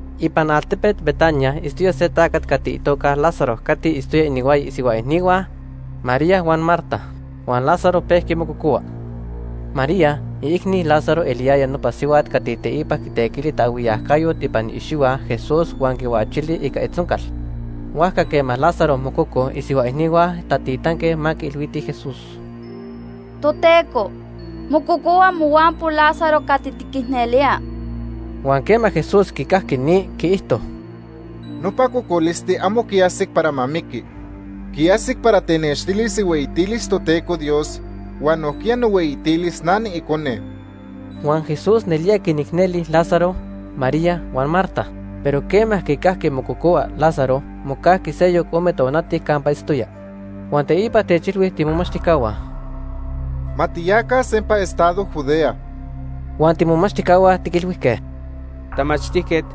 Ipan altepet Betania itztoya se tacat cati itoca Lázaro cati quipixqui ichaj inihuaya isihua icnihua, María huan Marta. Huan Lázaro pejqui mococohua. (María, iicni Lázaro, eliyaya nopa sihuat cati teipa quitequili taajhuiyacayot ipan iicxihua Jesús huan quihuachili ica itzoncal.) Huajca quema Lázaro mococo, isihua icnihua tatitanque ma quiilhuitij Jesús: ―Toteco, mococohua mohuampo Lázaro cati tiquicnelía. Huan quema Jesús quicajqui ni, quiijto: ―Nopa cocolisti amo quiajsic para ma miqui. Quiajsic para tenextilis ihueyitilis Toteco Dios huan nojquiya nohueyitilis na niIcone. Huan Jesús nelía quinicneli Lázaro, María huan Marta. Pero quema quicajqui mococohua Lázaro, mocajqui seyoc ome tonati campa itztoya. Huan teipa techilhui tiimomachtijcahua: ―Ma tiyaca sempa estado Judea. Huan tiimomachtijcahua tiquilhuijque: ―Tamachtijquet,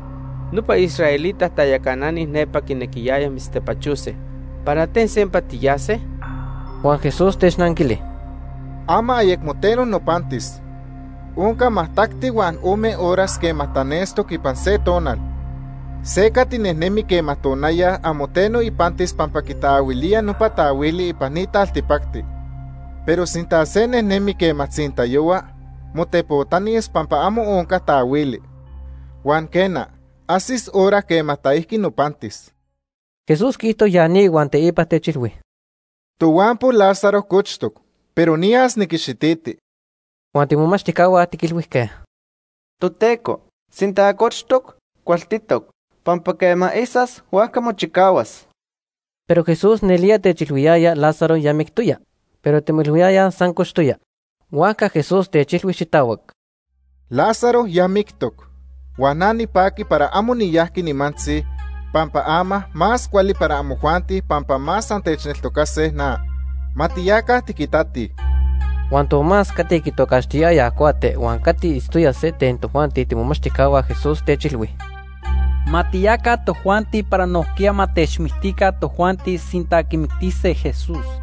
nopa israelita tayacanani nepa quinequiyayaj mitztepachose. ¿Para ten sempa tiyase? Huan Jesús technanquili: ―Ama ayemo teno nopantis. Onca majtacti huan ome horas quema tanestoc ipan se tonal. Se cati nejnemi quema tonaya amo teno ipantis pampa quitaahuilía nopa taahuili ipan ni taltipacti. Pero sinta se nejnemi quema tzintayohua, motepotanis pampa amo onca taahuili. Huan quena, ajsis hora quema taijqui nopantis. Jesús quiijto ya ni huan teipa techilhui: ―Tohuampo Lázaro cochtoc, pero niyas niquixititi. Huan tiimomachtijcahua tiquilhuijque: ―Toteco, sinta cochtoc, cualtitoc, pampa quema isas, huajca mochicahuas. Pero Jesús nelía techilhuiyaya Lázaro ya mictoya, pero timoilhuiyayaj san cochtoya. Huajca Jesús techilhui xitahuac: ―Lázaro ya mictoc. Huan na nipaqui para amo niyajqui nimantzi pampa ama más cuali para amojuanti pampa más antechneltocase na. Ma tiyaca tiquitatij. Huan Tomás, cati quitocaxtiyayaj Cuate huan cati itztoya se ten tojuanti tiimomachtijcahua Jesús, techilhui: ―Ma tiyaca tojuanti para nojquiya ma techmictica tojuanti sinta quimictise Jesús.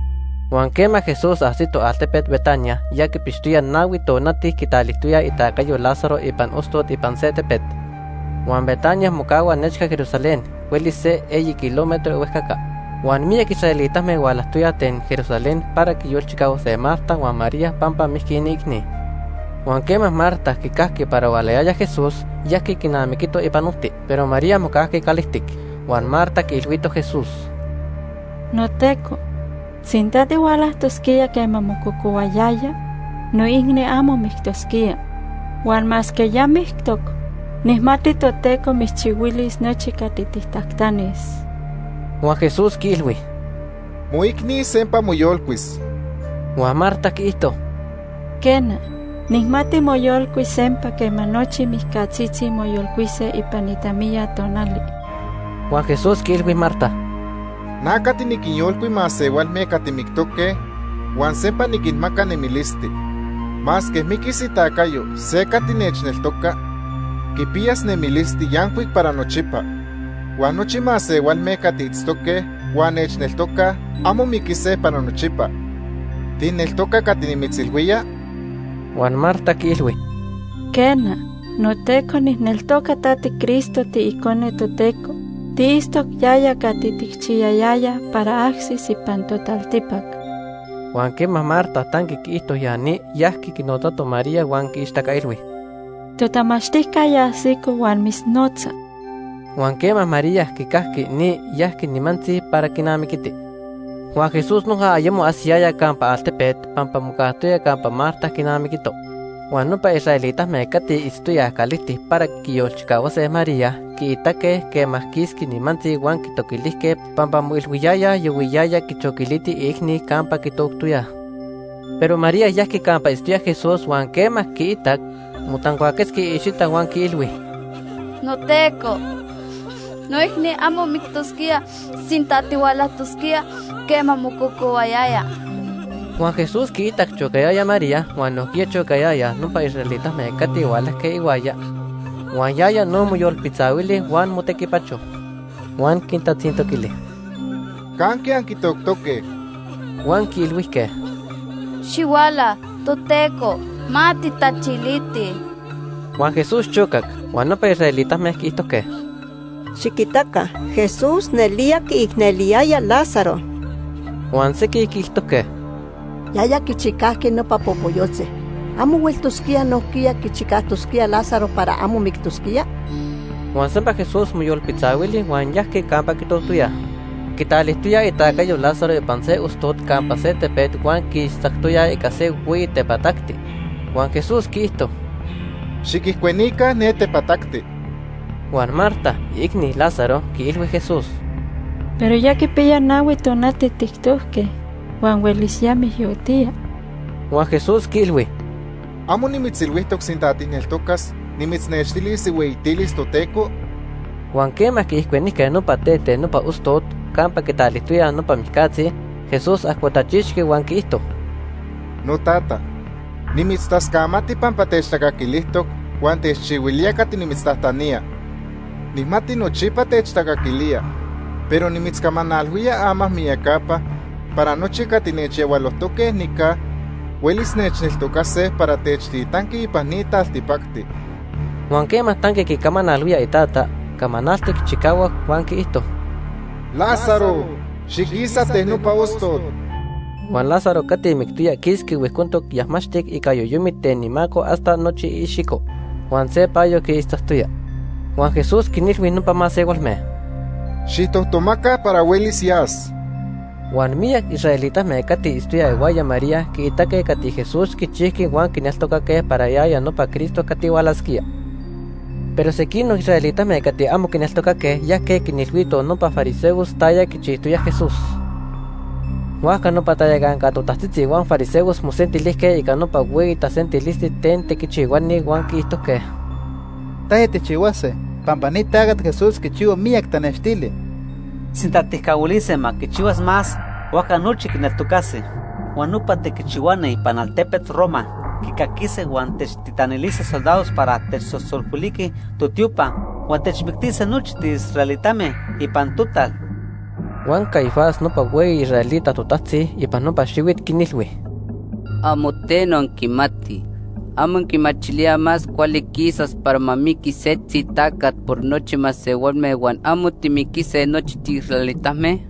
Huan quema Jesús ajsito altepet Betania, ya quipixtoya nahui tonati quitalijtoyaj itacayo Lázaro ipan ostot ipan se tepet. Huan Betania mocahua nechca Jerusalén, huelis se eyi kilómetro ihuejcaca. Huan miyac israelitame hualajtoyaj ten Jerusalén para quinyolchicahuase Marta huan María pampa mijqui iniicni. Huan quema Marta quicajqui para hualayaya Jesús, yajqui quinamiquito ipan ojti, pero María mocajqui calijtic. Huan Marta quiilhuito Jesús: ―NoTeco, sinta tihualajtosquía quema mococohuayaya, noicni amo mictosquía. Huan masque ya mictoc, nijmati Toteco mitzchihuilis nochi cati tijtajtanis. Huan Jesús quiilhui: ―Moicni sempa moyolcuis. Huan Marta quiijto: ―Quena, nijmati moyolcuis sempa quema nochi mijcatzitzi moyolcuise ipan itamiya tonali. Huan Jesús quiilhui Marta: ―Na cati niquinyolcui masehualme cati mictoque huan sempa niquinmaca nemilisti. Masque miquis itacayo se cati nechneltoca, quipiyas nemilisti yancuic para nochipa. Huan nochi masehualme cati itztoque huan nechneltocaj amo miquise para nochipa. ¿Tijneltoca cati nimitzilhuía? Huan Marta quiilhui: ―Quena, noTeco nijneltoca ta tiCristo, tiIcone Toteco. Tiitztoc yaya cati tijchiyayayaj para ajsis ipan totaltipac. Huan quema Marta tanqui quiijto ya ni, yajqui quinotzato María huan quiixtacailhui: ―Totamachtijca ya ajsico huan mitznotza. Huan quema María quicajqui ni, yajqui nimantzi para quinamiquiti. Huan Jesús noja ayemo ajsiyaya campa altepet pampa mocajtoya campa Marta quinamiquito. Huan nopa israelitame cati itztoyaj calijtic para quiyolchicahuase María quiitaque quema quisqui nimantzi huan quitoquilijque pampa moilhuiyayaj yahuiyaya quichoquiliti iicni campa quitoctoyaj. Pero María yajqui campa itztoya Jesús huan quema quiitac, motancuaquetzqui iicxita huan quiilhui: ―NoTeco, noicni amo mictosquía sinta tihualajtosquía quema mococohuayaya. Huan Jesús quiitac chocayaya María huan nojquiya chocayayaj nopa israelitame cati hualajque ihuaya, huan yaya no moyolpitzahuili huan motequipacho. Huan quintatzintoquili: ―¿Canque anquitoctoque? Huan quiilhuijque: ―Xihuala, Toteco, ma tijtachilitij. Huan Jesús chocac. Huan nopa israelitame quiijtojque: ―Xiquitaca, Jesús nelía quiicneliyaya Lázaro. Huan sequij quiijtojque: ―Yaya quichicajqui nopa popoyotzi. ¿Amo hueltosquía nojquiya quichicajtosquía Lázaro para amo mictosquía? Huan sempa Jesús moyolpitzahuili huan yajqui campa quitoctoyaj. Quitalijtoyaj itacayo Lázaro ipan se ostot campa se tepet huan quiixtzactoyaj ica se hueyi tepatacti. Huan Jesús quiijto: ―Xiquijcuenica ne tepatacti. Huan Marta, iicni Lázaro, quiilhui Jesús: ―Pero ya quipiya nahui tonati tijtojque huan huelis ya mijyotía. Huan Jesús quiilhui: ―¿Amo nimitzilhuijtoc sinta tijneltocas, nimitznextilis ihueyitilis Toteco? Huan quema quiijcuenijque nopa tet ten nopa ostot campa quitalijtoyaj nopa mijcatzi, Jesús ajcotachixqui huan quiijto: ―Notata, nimitztascamati pampa techtacaquilijtoc huan techchihuilía cati nimitztajtanía. Nijmati nochipa techtacaquilía, pero nimitzcamanalhuía ama miyacapa para nochi cati nechyahualojtoque nica huelis nechneltocase para techtitantoc ipan ni taltipacti. Huan quema tanqui quicamanalhuía iTata, camanaltic chicahuac huan quiijto: ―Lázaro, xiquisa ten nopa ostot. Huan Lázaro cati mictoya quisqui huijcontoc yajmaxtic ica yoyomit ten imaco hasta nochi iicxico, huan se payo quiixtzacuayaya. Huan Jesús quinilhui nopa masehualme: ―Xijtojtomaca para huelis yas. Huan miyac israelitame cati itztoyaj ihuaya María quiitaque cati Jesús quichijqui huan quineltocaque para yaya nopa Cristo cati hualasquía. Pero sequinoc israelitame cati amo quineltocaque yajque quinilhuitoj nopa fariseos taya quichijtoya Jesús. Huajca nopa tayacanca totajtzitzi huan fariseos mosentilijque ica nopa hueyi tasentilisti ten tequichihuani huan quiijtojque: ―¿Taya tijchihuase? Pampa ni tacat Jesús quichihua miyac tanextili. Sinta tijcahuilise ma quichihuas más, huajca nochi quineltocase. Huan nopa tequichihuani ipan altepet Roma quicaquise huan techtitanilise soldados para techsosolhuiliquij totiopa huan techmictise nochi tiisraelitame ipan total. Huan Caifás nopa hueyi israelita totajtzi ipan nopa xihuit quinilhui: ―Amo teno anquimatij. ¿Amo anquimachilíaj más cuali quisas para ma miquis setzi tacat por nochi masehualme huan amo timiquise nochi tiisraelitame?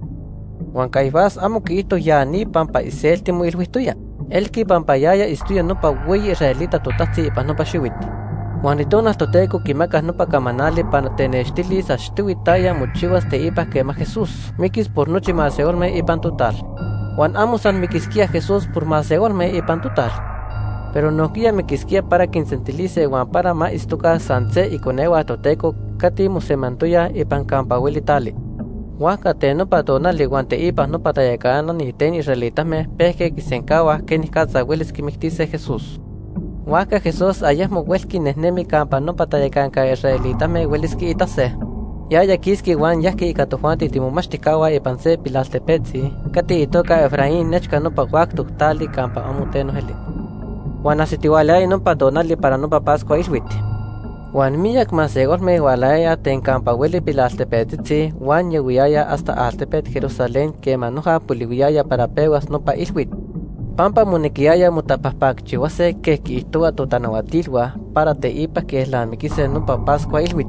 Huan Caifás amo quiijto ya ni pampa iselti moilhuijtoya. Elqui pampa yaya itztoya nopa hueyi israelita totajtzi ipan nopa xihuit huan Itonal Toteco quimacac nopa camanali para tenextilis achtohui taya mochihuas teipa quema Jesús miquis por nochi masehualme ipan total. Huan amo san miquisquía Jesús por masehualme ipan total, pero nojquiya miquisquía para quinsentilise huan para ma itztoca san se iconehua Toteco cati mosemantoyaj ipan campa hueli tali. Huajca ten nopa tonali huan teipa nopa tayacanani ten israelitame pejque quisencahuaj quenicatza huelis quimictise Jesús. Huajca Jesús ayecmo huelqui nejnemi campa nopa tayacanca israelitame huelis quiitase. Yaya quisqui huan yajqui ica tojuanti tiimomachtijcahua ipan se pilaltepetzi cati itoca Efraín nechca nopa huactoc tali campa amo teno eli. Huan ajsitihualayaya nopa tonali para nopa Pascua Ilhuit. Huan miyac masehualme hualayayaj ten campa hueli pilaltepetzitzi huan yahuiyayaj hasta altepet Jerusalén quema noja polihuiyaya para pehuas nopa ilhuit pampa monequiyaya motapajpacchihuase quej quiijtohuaj totanahuatilhua para teipa quielnamiquise nopa Pascua Ilhuit.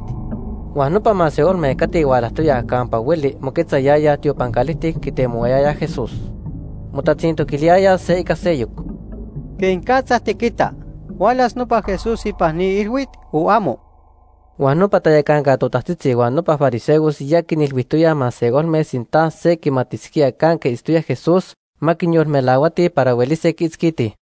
Huan nopa masehualme cati hualajtoyaj campa hueli moquetzayayaj tiopan calijtic quitemohuayayaj Jesús. Motatzintoquiliyayaj se ica seyoc: ―¿Quenicatza tiquita? ¿Hualas nopa Jesús ipan ni ilhuit o amo? Huan nopa tayacanca totajtzitzi huan nopa fariseos ya quinilhuijtoyaj masehualme sinta se quimatisquía canque itztoya Jesús, ma quinyolmelahuatij para huelise quiitzquitij.